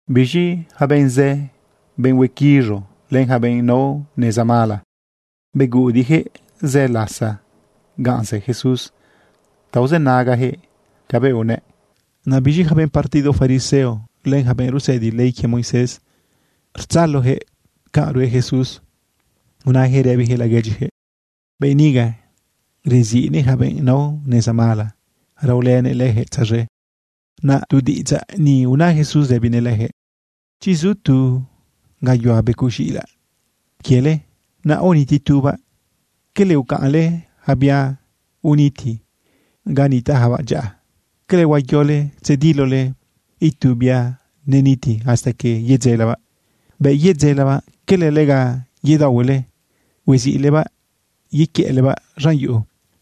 Biz̃i yaca benꞌ zë, benꞌ huequiz̃u len yaca benꞌ nao neza mala, beguꞌudiꞌyaquëꞌ zë lasa ganꞌ zë Jesús ta uzënagayaquëꞌ cabëꞌ unëꞌ. Naꞌ biz̃i yaca benꞌ partido fariseo, len yaca benꞌ rusëdi ley quie Moisés, rtzaloyaquëꞌ canꞌ rue Jesús, unayaquëꞌ rëbiyaquëꞌ laguedyiyaquëꞌ: ―Benꞌ niga reziꞌnëꞌ yaca benꞌ nao neza mala, raolënëꞌ leyaquëꞌ tzaz̃e. Naꞌ tu diꞌidzaꞌ ni una Jesús rëbinëꞌ leyaquëꞌ: ―Chi zu tu gayuhua becoꞌ z̃iꞌilaꞌ quiele, naꞌ aoniti tubaꞌ, ¿cala ucaꞌnle yaca bia biuniti ga nitaꞌyacabaꞌ dyaꞌa? ¿Cala huayole tzedilole itu bia neniti hasta que yedzelelebaꞌ? Bëꞌ yedzelelebaꞌ ¿cala lega yedaohuele hueziꞌlebaꞌ yequiëꞌlebaꞌ z̃an yuꞌu?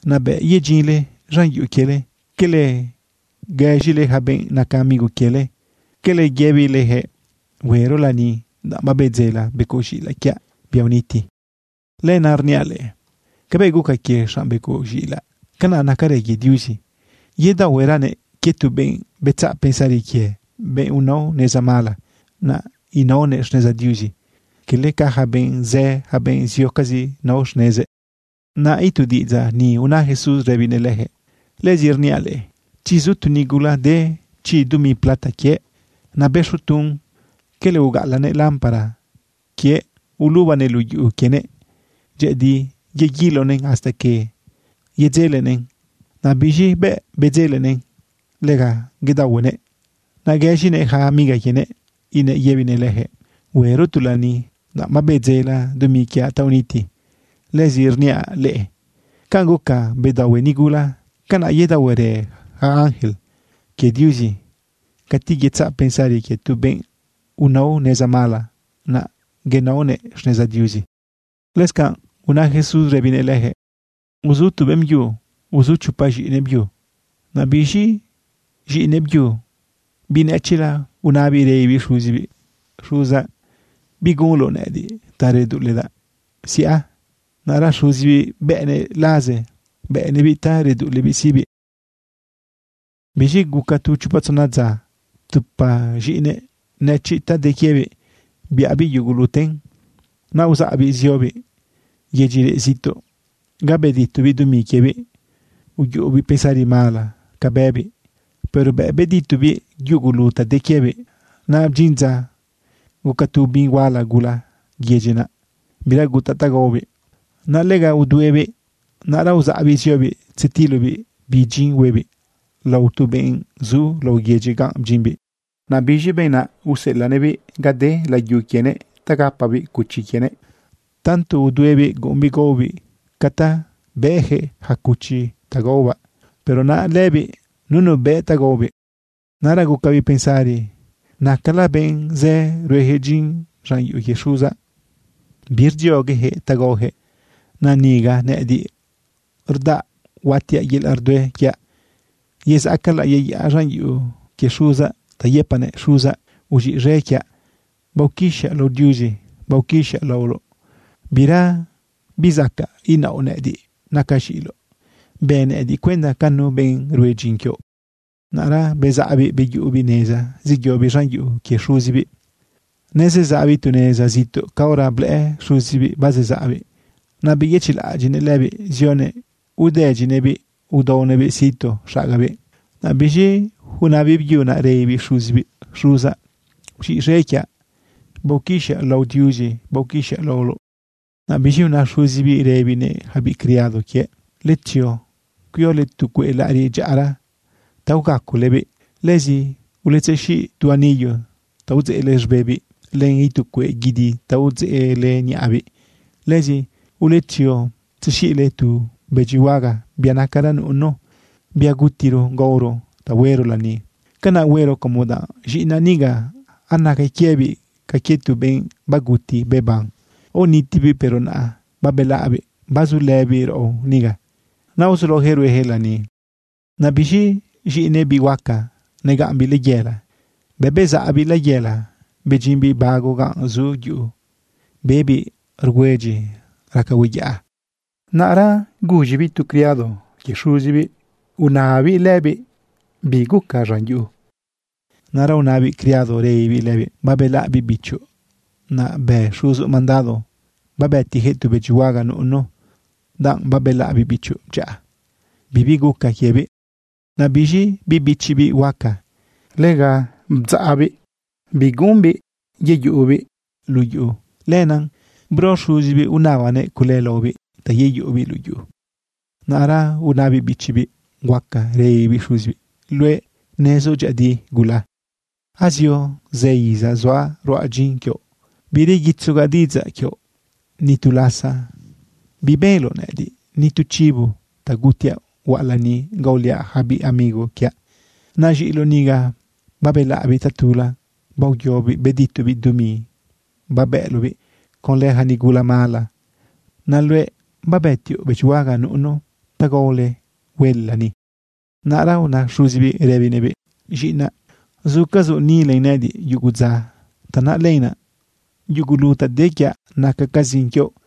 Naꞌ bëꞌ bedyinle z̃an yuꞌu quiele ¿cala guëz̃ile yaca benꞌ naca amigo quiele? ¿Cala yëbileyaquëꞌ: “Huero lani, danꞌ babedzeledaꞌ becoꞌ z̃iꞌilaꞌ quiaꞌ, bia uniti”? Lenaꞌ rniaꞌ leꞌe, cabëꞌ guca quie xanꞌ becoꞌ z̃iꞌilaꞌ, canaꞌ nacarë quie Diuzi. Yedaohueranëꞌ quie tu benꞌ betzaꞌ pensari quie, benꞌ unao neza mala, naꞌ inaonëꞌ xneza Diuzi, cala ca yaca benꞌ zë, yaca benꞌ ziocazi nao xnezëꞌ. Naꞌ itu diꞌidzaꞌ ni una Jesús rëbinëꞌ leyaquëꞌ: ―Lëzi rniaꞌ leꞌe, chi zu tu nigula de chi dumi plata quiëꞌ, naꞌ bëxo tun, ¿cala ugaꞌalaꞌnëꞌ lámpara quiëꞌ, ulubanëꞌ luꞌu yuꞌu quienëꞌ dyëꞌëdi, yeguilonëꞌn hasta que yedzelenëꞌn? Naꞌ biz̃i bëꞌ bedzelenëꞌn, lega bedaohuenëꞌ. Naꞌ guëz̃inëꞌyaca amiga quienëꞌ inëꞌ yëbinëꞌ leyaquëꞌ: “Huero tu lani, danꞌ babedzeledaꞌ dumi quiaꞌ ta uniti.” Lëzi rniaꞌ leꞌe, canꞌ guca bedaohue nigula, canaꞌ yedaohuerë yaca ángel quie Diuzi cati yetzaꞌ pensari quie tu benꞌ unao neza mala, naꞌ inaonëꞌ xneza Diuzi. Lëscanꞌ una Jesús rëbinëꞌ leyaquëꞌ: ―Uzu tu beꞌmbyu uzu chopa z̃iꞌinëꞌ byu. Naꞌ biz̃i z̃iꞌinëꞌ byu, biꞌ nëchiꞌla, unabiꞌ rëbibiꞌ xuzibiꞌ: “Xuzaꞌ, ¿bigunloꞌ nëꞌëdiꞌ ta reduꞌuledaꞌ siꞌa? Naꞌra xuzibiꞌ bëꞌnëꞌ laze, bëꞌnëꞌbiꞌ ta reduꞌulebiꞌ siꞌbiꞌ. Biz̃i guca tu chopa tzona dza, ptupa z̃iꞌinëꞌ nëchiꞌ ta de quiebiꞌ biꞌabiꞌ yuguluten. Naꞌ uzaꞌbiꞌ ziobiꞌ yedyi reꞌ zituꞌ ga beditobiꞌ dumi quiebiꞌ uyuꞌubiꞌ pensari mala ca bëbiꞌ. Pero bëꞌ beditobiꞌ yugulu ta de quiebiꞌ, naꞌ bdyin dza guca tu ubin huala gula yedyi naꞌ. Bira gutaꞌ ta gaobiꞌ, naꞌ lega uduebiꞌ. Naꞌra uzaꞌbiꞌ ziobiꞌ tzetilobiꞌ bi dyin huebiꞌ lao tu benꞌ zu lao yedyi ganꞌ bdyimbiꞌ. Naꞌ biz̃i benꞌ naꞌ useꞌelaꞌnëꞌbiꞌ ga de layu quienëꞌ ta gapabiꞌ cuchi quienëꞌ. Tanto uduebiꞌ guꞌumbiꞌ gaobiꞌ ca ta bëꞌyaquëꞌ yaca cuchi ta gaobaꞌ. Pero naꞌ lëbiꞌ nunu bëꞌ ta gaobiꞌ. Naꞌra gucabiꞌ pensari: “¡Nacala benꞌ zë rueyaquëꞌ dyin z̃an yuꞌu quie xuzaꞌ, birdziogueyaquëꞌ ta gaoyaquëꞌ! ¡Naꞌ niga nëꞌëdiꞌ rudaꞌa huatiaꞌ yelaꞌ rdue quiaꞌ! Yezaꞌcalaꞌ yeyaꞌa z̃an yuꞌu quie xuzaꞌ ta yëpaꞌnëꞌ: Xuzaꞌ, uz̃iꞌz̃e quiaꞌ. Baoquixaꞌ lao Diuzi. Baoquixaꞌ laoloꞌ. Bira bizacaꞌ inaoꞌ nëꞌëdiꞌ nacaꞌ z̃iꞌiloꞌ. Bë nëꞌëdiꞌ cuenda ca nu benꞌ rue dyin quioꞌ.” Naꞌra bezaꞌbiꞌ beyuꞌubiꞌ neza zeyobiꞌ z̃an yuꞌu quie xuzibiꞌ. ’Nezezaꞌbiꞌ tu neza zituꞌ caora blëꞌë xuzibiꞌ bazezaꞌbiꞌ. Naꞌ beyëchiꞌlaꞌadyiꞌnëꞌ lëbiꞌ zionëꞌ udëdyinëꞌbiꞌ udaonëꞌbiꞌ situ xagabiꞌ. Naꞌ biz̃i una biꞌbyu naꞌ rëbibiꞌ xuzibiꞌ: “Xuzaꞌ, uz̃iꞌz̃e quiaꞌ. Baoquixaꞌ lao Diuzi. Baoquixaꞌ laoloꞌ.” Naꞌ biz̃i una xuzibiꞌ rëbinëꞌ yaca biꞌ criado quiëꞌ: “Uletzio cuiole tu cueꞌ laꞌariꞌ dyaꞌara ta ugacolebiꞌ. Lëzi uletzexiꞌ tu anillo ta udzeꞌle z̃bebiꞌ len itu cueꞌ guidi ta udzeꞌle niꞌabiꞌ. Lëzi uletzio tzexiꞌle tu bëdyihuaga, bia nacara nuꞌunu, bia gutiro gaoro ta huero lani. Canaꞌ huero como danꞌ z̃iꞌinaꞌ niga anaca quiebiꞌ ca quie tu benꞌ baguti beban. Aonitibiꞌ, pero naꞌ babelaꞌbiꞌ bazulëbiꞌ raꞌo niga.” Naꞌ uzulaoyaquëꞌ rueyaquëꞌ lani. ’Naꞌ biz̃i z̃iꞌinëꞌ biꞌ huaca, negaꞌmbiꞌ layela. Bëꞌ bezaꞌbiꞌ layela bedyimbiꞌ bago ganꞌ zu yuꞌu, bebiꞌ rgüedyi raca hueyaꞌa. Naꞌra guz̃ibiꞌ tu criado quie xuzibiꞌ unababiꞌ lëbiꞌ bi guca z̃an yuꞌu. Naꞌ una biꞌ criado rëbibiꞌ lëbiꞌ: “Babelaꞌ biꞌ bichoꞌ. Naꞌ bë xuzoꞌ mandado babëtiyaquëꞌ tu bëdyihuaga nuꞌunu, danꞌ babelaꞌ biꞌ bichoꞌ dyaꞌa, bibi guca quiebiꞌ.” Naꞌ biz̃i biꞌ bichibiꞌ huaca, lega rdzaꞌbiꞌ bireꞌembiꞌ yeyuꞌubiꞌ luꞌu yuꞌu. Lenaꞌ bro xuzibiꞌ unabanëꞌ cule laobiꞌ ta yeyuꞌubiꞌ luꞌu yuꞌu. Naꞌra una biꞌ bichibiꞌ huaca rëbibiꞌ xuzibiꞌ: “Luëꞌ nezoꞌ dyëꞌëdi gula azio zë iza zuaꞌ ruaꞌ dyin quioꞌ. Bireguitzogaꞌ diꞌidzaꞌ quioꞌ. Ni tu lasa bibenloꞌ nëꞌëdiꞌ ni tu chivo ta gutiaꞌ huaꞌ lani gaoliaꞌ yaca biꞌ amigo quiaꞌ. Naꞌ z̃iꞌiloꞌ niga, babelaꞌbiꞌ tatula. Baoyobiꞌ beditobiꞌ dumi babëꞌloꞌbiꞌ conlë yaca nigula mala. Naꞌ luëꞌ babetioꞌ bëdyihuaga nuꞌunu ta gaole huele lani.” Naꞌra una xuzibiꞌ rëbinëꞌbiꞌ: “Z̃iꞌinaꞌ, zucazoꞌ ni len nëꞌëdiꞌ yugu dza. Tanaꞌ lenaꞌ yugulu ta de quiaꞌ nacacazin quioꞌ.